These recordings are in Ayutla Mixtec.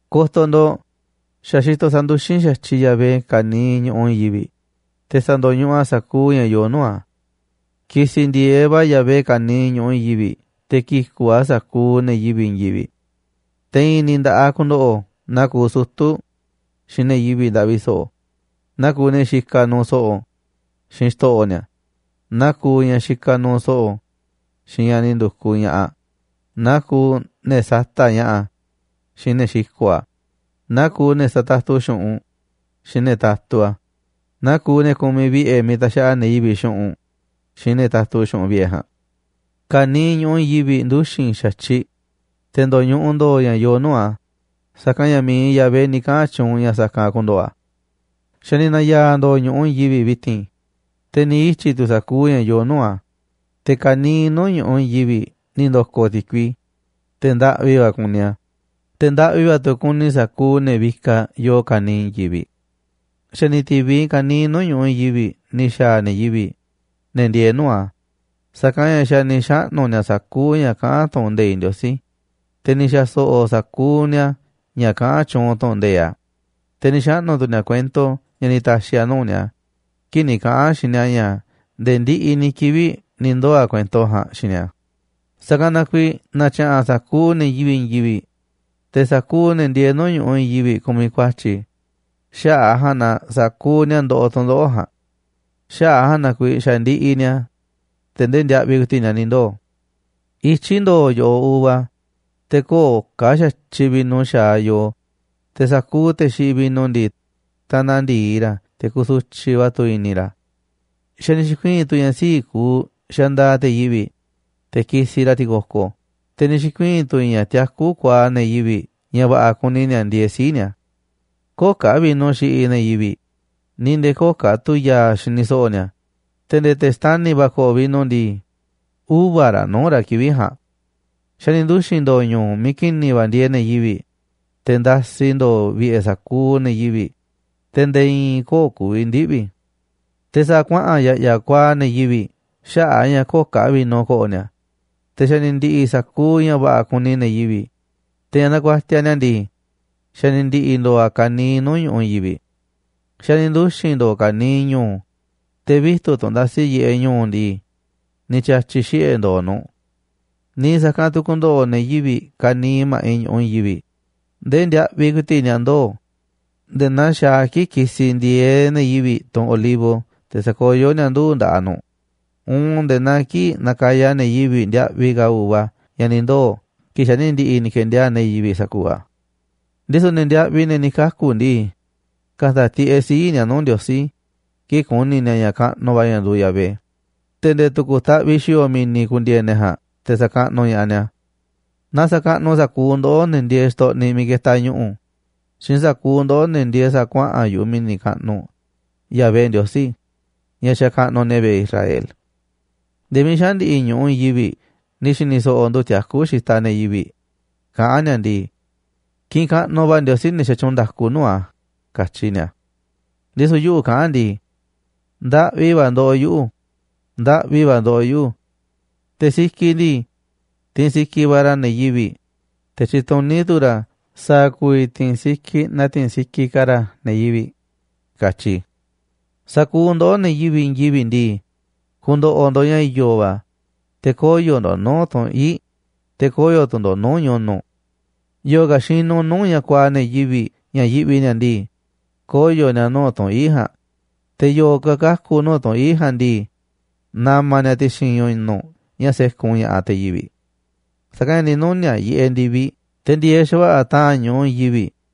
Ko̱to̱ ndo̱ꞌ, xa̱ xitoꞌ sa̱nduxín xa̱tyiꞌ Yahvé ka̱niiꞌ ñu̱ꞌuꞌ i̱i̱n yivi̱ꞌ, te̱ sa̱ndo̱ñuꞌuꞌ a̱ sa̱kuuꞌ ña̱ yoo nuu̱ꞌ a̱. Ki̱si̱ ndi̱e̱eꞌ va̱ Yahvé ka̱niiꞌ ñu̱ꞌuꞌ i̱i̱n yivi̱ꞌ te̱ ki̱ku̱ꞌ a̱ sa̱kuuꞌ ne̱ yivi̱ꞌ i̱i̱n yivi̱ꞌ. Te̱ i̱i̱n ni̱ nda̱ꞌaꞌ ku̱ndo̱ꞌo̱ naa kuuꞌ sutu̱ xiinꞌ ne̱ yivi̱ꞌ ndaꞌvi so̱ꞌo̱, naa kuuꞌ ne̱ xikaꞌ nuuꞌ so̱ꞌo̱ xiinꞌ xto̱ꞌo̱ ni̱a̱, naaꞌ kuuꞌ ñaꞌ xikaꞌ nuuꞌ so̱ꞌo̱ xiinꞌ ñaꞌ ni̱ ndu̱kuꞌ ña̱ꞌaꞌ, naa kuuꞌ ne̱ sata̱ꞌ ña̱ꞌa̱ xiinꞌ ne̱ xiko̱ꞌ a̱, naa kuuꞌ ne̱ satatu xu̱ꞌunꞌ xiinꞌ ne̱ tatu a̱, naa kuuꞌ ne̱ kumiꞌ vi̱ꞌe̱ miiꞌ taxaꞌa ne̱ yivi̱ꞌ xu̱ꞌunꞌ xiinꞌ ne̱ tatu xu̱ꞌunꞌ vi̱ꞌe̱ ja̱a̱nꞌ. Ka̱niiꞌ ñu̱ꞌuꞌ i̱i̱n yivi̱ꞌ nduxi̱n xa̱tyiꞌ, te̱ ndo̱ñuꞌuꞌ ndo̱o̱ ña̱ yoo nuu̱ꞌ a̱, sa̱kanꞌ ña̱ miiꞌ Yahvé ni̱ kaꞌa̱n tyuunꞌ ña̱ sa̱kanꞌ ku̱ndo̱ꞌo̱ a̱. Xa̱ ni̱ na̱ya̱a̱ ndo̱o̱ ñu̱ꞌuꞌ i̱i̱n yivi̱ꞌ vi̱ti̱n, te̱ ni̱ ityi̱ tu̱ sa̱kuuꞌ ña̱ yoo nuu̱ꞌ a̱, te̱ ka̱niiꞌ nuu̱ꞌ ñu̱ꞌuꞌ i̱i̱n yivi̱ꞌ ni̱ ndo̱ko̱ ti̱kui, te̱ ndaꞌvi va̱ kuni a̱, te̱ ndaꞌvi va̱ tu̱ kuni sa̱kuuꞌ ne̱ vikaꞌ yoo ka̱niiꞌ i̱i̱n yivi̱ꞌ. Xa̱ ni̱ ti̱viꞌ ka̱niiꞌ nuu̱ꞌ ñu̱ꞌuꞌ i̱i̱n yivi̱ꞌ ni̱ xa̱a̱ ne̱ yivi̱ꞌ, ne̱ ndieeꞌ nuu̱ꞌ a̱, sa̱kanꞌ ña̱ xa̱ ni̱ xaꞌnu̱ ni̱a̱ sa̱kuuꞌ ña̱ kaꞌán tu̱ꞌu̱n nde̱iꞌ Ndiosí, te̱ ni̱ xa̱ so̱ꞌo̱ sa̱kuuꞌ ni̱a̱ ña̱ kaꞌán tyuunꞌ tu̱ꞌu̱n nde̱iꞌ a̱, te̱ ni̱ xaꞌnu̱ tu̱ ni̱a̱ kuento ña̱ ni̱ ta̱xi̱ a̱ nuu̱ꞌ ni̱a̱ kii̱ꞌ ni̱ kaꞌa̱n a̱ xiinꞌ ni̱a̱ ña̱ nde̱e̱ ndiꞌiꞌ ni̱ kivi̱ꞌ ni̱ ndoo̱ a̱ kuento a̱ ja̱a̱nꞌ xiinꞌ ni̱a̱. Sa̱kanꞌ na kuiiꞌ natyaꞌanꞌ sa̱kuuꞌ ne̱ yivi̱ꞌ i̱i̱n yivi̱ꞌ, te̱ sa̱kuuꞌ ne̱ ndieeꞌ nuu̱ꞌ ñu̱ꞌuꞌ i̱i̱n yivi̱ꞌ kumiꞌ ku̱a̱tyi̱, xaꞌa̱ꞌ ja̱a̱nꞌ na sa̱kuuꞌ ni̱a̱ ndoꞌoꞌ tu̱ndoꞌo̱ꞌ ja̱a̱nꞌ. Xaꞌa̱ꞌ a̱ ja̱a̱nꞌ naa kuiiꞌ xa̱ ndiꞌiꞌ ni̱a̱, te̱ ndee ndiaꞌviꞌ ku̱i̱ti̱ꞌ ni̱a̱ ni̱ ndoo̱. Ityí ndo̱o̱ yo̱ꞌoꞌ uva, te̱ köo̱ꞌ ka̱ xa̱tyiꞌ vino xa̱aꞌ yoo, te̱ sa̱kuuꞌ te̱ xiꞌiꞌ vino ndii, tanaꞌ ndi̱i ra̱ te̱ kusutyiꞌ va̱ tu̱ i̱ni̱ ra̱. Xa̱ ni̱ xi̱kuii̱n tu̱ ña̱ sii̱ꞌ kuuꞌ xandaaꞌ te̱ yivi̱ꞌ, te̱ kisiꞌ ra̱ ti̱ko̱ko̱, te̱ ni̱ xi̱kuii̱n tu̱ ña̱ tiakú kuaaꞌ ne̱ yivi̱ꞌ ña̱ va̱ꞌa̱ kuni ni̱a̱ ndieeꞌ sii̱ꞌ ni̱a̱. Köo̱ꞌ ka̱ vino xiꞌiꞌ ne̱ yivi̱ꞌ, ni̱ nde̱e̱ köo̱ꞌ ka̱ tu̱ ya̱a̱ xini so̱ꞌo̱ ni̱a̱, te̱ nde̱e̱ te̱ xtani̱ va̱ ko̱ꞌo̱ vino ndii, uva̱ raꞌ nuu̱ꞌ ra̱ kivi̱ꞌ ja̱a̱nꞌ. Xa̱ ni̱ nduxi̱n ndo̱o̱ ñu̱u̱ miiꞌ ki̱ni̱ va̱ ndieeꞌ ne̱ yivi̱ꞌ, te̱ ndasi ndo̱o̱ vi̱ꞌe̱ sa̱kuuꞌ ne̱ yivi̱ꞌ, te̱ nde̱e̱ i̱i̱n köo̱ꞌ ku̱vi̱ ndiꞌvi̱. Te̱ sa̱a̱ kuaꞌa̱n ya̱ꞌya̱ kuaaꞌ ne̱ yivi̱ꞌ xaꞌa̱ꞌ a̱ ña̱ köo̱ꞌ ka̱ vino ko̱ꞌo̱ ni̱a̱, te̱ xa̱ ni̱ ndi̱ꞌi̱ sa̱kuuꞌ ña̱ va̱ꞌa̱ kuni ne̱ yivi̱ꞌ, te̱ ña̱ nakuatiaꞌ ni̱a̱ ndii, xa̱ ni̱ ndi̱ꞌi̱ ndo̱o̱ a̱ ka̱niiꞌ nuu̱ꞌ ñu̱ꞌuꞌ i̱i̱n yivi̱ꞌ. Xa̱ ni̱ nduxi̱n ndo̱o̱ ka̱niiꞌ ñu̱u̱, te̱ vitu̱ꞌ tunꞌ ndasiꞌ yiꞌeꞌ ñu̱u̱ ndii, ni̱ tya̱tyi̱ xiꞌe̱ ndo̱o̱ nu̱ꞌ. Niiꞌ sa̱kanꞌ tu̱ ku̱ndo̱ꞌo̱ ne̱ yivi̱ꞌ ka̱niiꞌ ma̱ꞌiꞌ ñu̱ꞌuꞌ i̱i̱n yivi̱ꞌ ndee ndiaꞌviꞌ ku̱i̱ti̱ꞌ ni̱a̱ ndoo̱, nde̱e̱ naa xaaꞌ a̱ kii̱ꞌ kisiꞌ ndi̱e̱eꞌ ne̱ yivi̱ꞌ tunꞌ olivo te̱ sakoyó ni̱a̱ nduu̱ꞌ nda̱ꞌaꞌ nu̱ꞌ, uun nde̱e̱ naa kii̱ꞌ nakaya ne̱ yivi̱ꞌ ndiaꞌviꞌ ka̱ uva ña̱ ni̱ ndoo̱ kii̱ꞌ xa̱ ni̱ ndi̱ꞌi̱ ni̱ ke̱ndiaa̱ꞌ ne̱ yivi̱ꞌ sa̱kuuꞌ a̱. Ndisu̱ ne̱ ndiaꞌviꞌ ne̱ ni̱ kaku̱ ndii, ka̱ta̱ tiꞌeꞌ sii̱ꞌ ni̱a̱ nuu̱ꞌ Ndiosí kii̱ꞌ ku̱ni̱ ni̱a̱ ña̱ kaꞌnuꞌ va̱ ña̱ nduuꞌ Yahvé, te̱ nde̱e̱ tu̱ku̱ taꞌviꞌ xi̱o̱o̱ mi̱ni̱ ku̱ndi̱e̱e̱ ne̱ ja̱a̱nꞌ te̱ sa̱kaꞌnuꞌ ña̱ꞌaꞌ ni̱a̱. Na sa̱kaꞌnuꞌ sa̱kuuꞌ ndoꞌó, ne̱ ndieeꞌ xtoꞌniꞌ miiꞌ ketaꞌ ñu̱ꞌu̱, xiinꞌ sa̱kuuꞌ ndoꞌó, ne̱ ndieeꞌ sa̱a̱ kuaꞌa̱n yu̱ꞌuꞌ mi̱ni̱ kaꞌnuꞌ, Yahvé Ndiosí, ña̱ xakaꞌnuꞌ ne̱ vi̱ꞌe̱ Israel. Nde̱e̱ miiꞌ xaꞌa̱n ndi̱ꞌi̱ ñu̱ꞌuꞌ i̱i̱n yivi̱ꞌ ni̱ xi̱ni̱ so̱ꞌo̱ ndu̱ tiakú xitaꞌ ne̱ yivi̱ꞌ, kaꞌán ni̱a̱ ndii: “Kiꞌinꞌ kaꞌnuꞌ va̱ Ndiosí, ne̱ xatyuunꞌ nda̱ku nuu̱ꞌ a̱”, katyi ni̱a̱. Ndisu̱ yuꞌu̱ kaꞌán ndii: “Ndaꞌvi va̱ ndoꞌoꞌ yuꞌu̱, ndaꞌvi va̱ ndoꞌoꞌ yuꞌu̱. Te̱ sikiꞌ ndii, tiinꞌ sikiꞌ va̱ ra̱ ne̱ yivi̱ꞌ, te̱ tyituní tu̱ ra̱ sa̱a̱ ku̱vi̱ ti̱i̱n sikiꞌ na ti̱i̱n sikiꞌ ka̱ ra̱ ne̱ yivi̱ꞌ”, katyi i̱. Sa̱kuuꞌ ndoꞌó, ne̱ yivi̱ꞌ i̱i̱n yivi̱ꞌ ndii, ku̱ndo̱ꞌo̱ ndo̱ꞌ ña̱ i̱yo̱ va̱, te̱ koyo̱ ndo̱ꞌ nuu̱ꞌ tunꞌ ii̱ꞌ, te̱ koyo̱ tu̱ ndo̱ꞌ nuu̱ꞌ ñu̱nu̱. Yo̱o̱ ka̱ xinuꞌ nuu̱ꞌ ña̱ kuaaꞌ ne̱ yivi̱ꞌ ña̱ yiꞌvi ni̱a̱ ndii, koyo̱ ni̱a̱ nuu̱ꞌ tunꞌ ii̱ꞌ ja̱a̱nꞌ, te̱ yo̱o̱ ka̱ kaku̱ nuu̱ꞌ tunꞌ ii̱ꞌ ja̱a̱nꞌ ndii, na̱ma̱ ni̱a̱ ti̱xi̱n ñu̱nu̱ꞌ ña̱ sékun ña̱ꞌaꞌ te̱ yivi̱ꞌ. Sa̱kanꞌ ña̱ ni̱ nuni̱a̱ꞌ yiꞌeꞌ ndi̱viꞌ te̱ ndi̱e̱eꞌ xa̱va̱ꞌa̱ ta̱a̱n xaꞌa̱ꞌ ñu̱ꞌuꞌ i̱i̱n yivi̱ꞌ.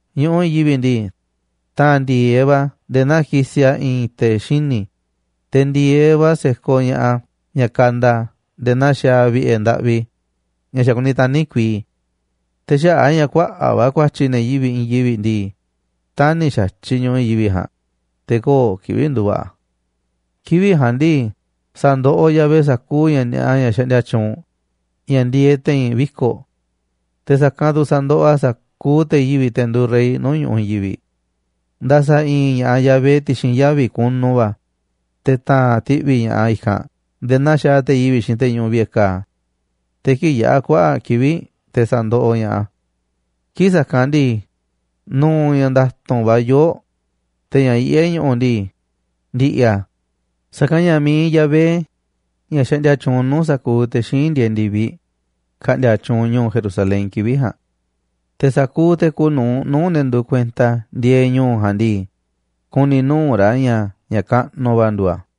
Ñu̱ꞌuꞌ i̱i̱n yivi̱ꞌ ndii, ta̱a̱n ndi̱e̱eꞌ va̱ a̱ nde̱e̱ naa kisiꞌ a̱ i̱i̱n te̱ xini̱, te̱ ndi̱e̱eꞌ va̱ se̱koꞌ ña̱ꞌaꞌ ña̱ kanda nde̱e̱ naa xaaꞌ vi̱ꞌe̱ ndaꞌvi ña̱ xa̱ kuni tani̱ kuii. Te̱ xaꞌa̱ꞌ a̱ ña̱ kuaꞌa̱ꞌ va̱ ku̱a̱tyi̱ ne̱ yivi̱ꞌ i̱i̱n yivi̱ꞌ ndii, tani̱ xa̱tyiꞌ ñu̱ꞌuꞌ i̱i̱n yivi̱ꞌ ja̱a̱nꞌ, te̱ köo̱ꞌ kivi̱ꞌ ndu̱va̱ꞌa̱ a̱. Kivi̱ꞌ ja̱a̱nꞌ ndii, sa̱ndoꞌoꞌ Yahvé sa̱kuuꞌ ña̱ ni̱a̱ꞌa ña̱ xaꞌndia tyuunꞌ, ña̱ ndieeꞌ te̱i̱n viko̱ꞌ, te̱ sa̱kanꞌ tu̱ sa̱ndoꞌoꞌ a̱ sa̱kuuꞌ te̱ yivi̱ꞌ, te̱ nduuꞌ rey nuu̱ꞌ ñu̱ꞌuꞌ i̱i̱n yivi̱ꞌ. Nda̱sa̱ i̱i̱n ña̱ꞌaꞌ Yahvé ti̱xi̱n yavi̱ kunu va̱, te̱ ta̱a̱n ti̱ꞌvi̱ ña̱ꞌaꞌ a̱ i̱kanꞌ nde̱e̱ naa xaaꞌ te̱ yivi̱ꞌ xiinꞌ te̱ ñuꞌuꞌ vi̱ꞌe̱ ka̱a̱, te̱ kii̱ꞌ yaꞌa̱ kuaꞌa̱ꞌ kivi̱ꞌ te̱ sa̱ndoꞌoꞌ ña̱ꞌaꞌ a̱. Kii̱ꞌ sa̱kanꞌ ndii, nu̱u̱ ña̱ nda̱tu̱nꞌ va̱ yoo̱ꞌ, te̱ ña̱ yiꞌé ñu̱ꞌu̱ ndii, ndi̱ꞌi̱ a̱. Sa̱kanꞌ ña̱ mi̱iꞌ Yahvé, ña̱ xaꞌndia tyuunꞌ nuu̱ꞌ sa̱kuuꞌ te̱ xíinꞌ ndieeꞌ ndi̱viꞌ, ka̱ꞌndi̱a̱ tyuunꞌ ñu̱u̱ Jerusalén kivi̱ꞌ ja̱a̱nꞌ. Te̱ sa̱kuuꞌ te̱ kuuꞌ nu̱uꞌ nuu̱ꞌ ne̱ nduuꞌ kuenta a̱ ndieeꞌ ñu̱u̱ ja̱a̱nꞌ ndii, ku̱ni̱ nuu̱ꞌ ra̱ ña̱ ña̱ kaꞌnuꞌ va̱ nduuꞌ a̱.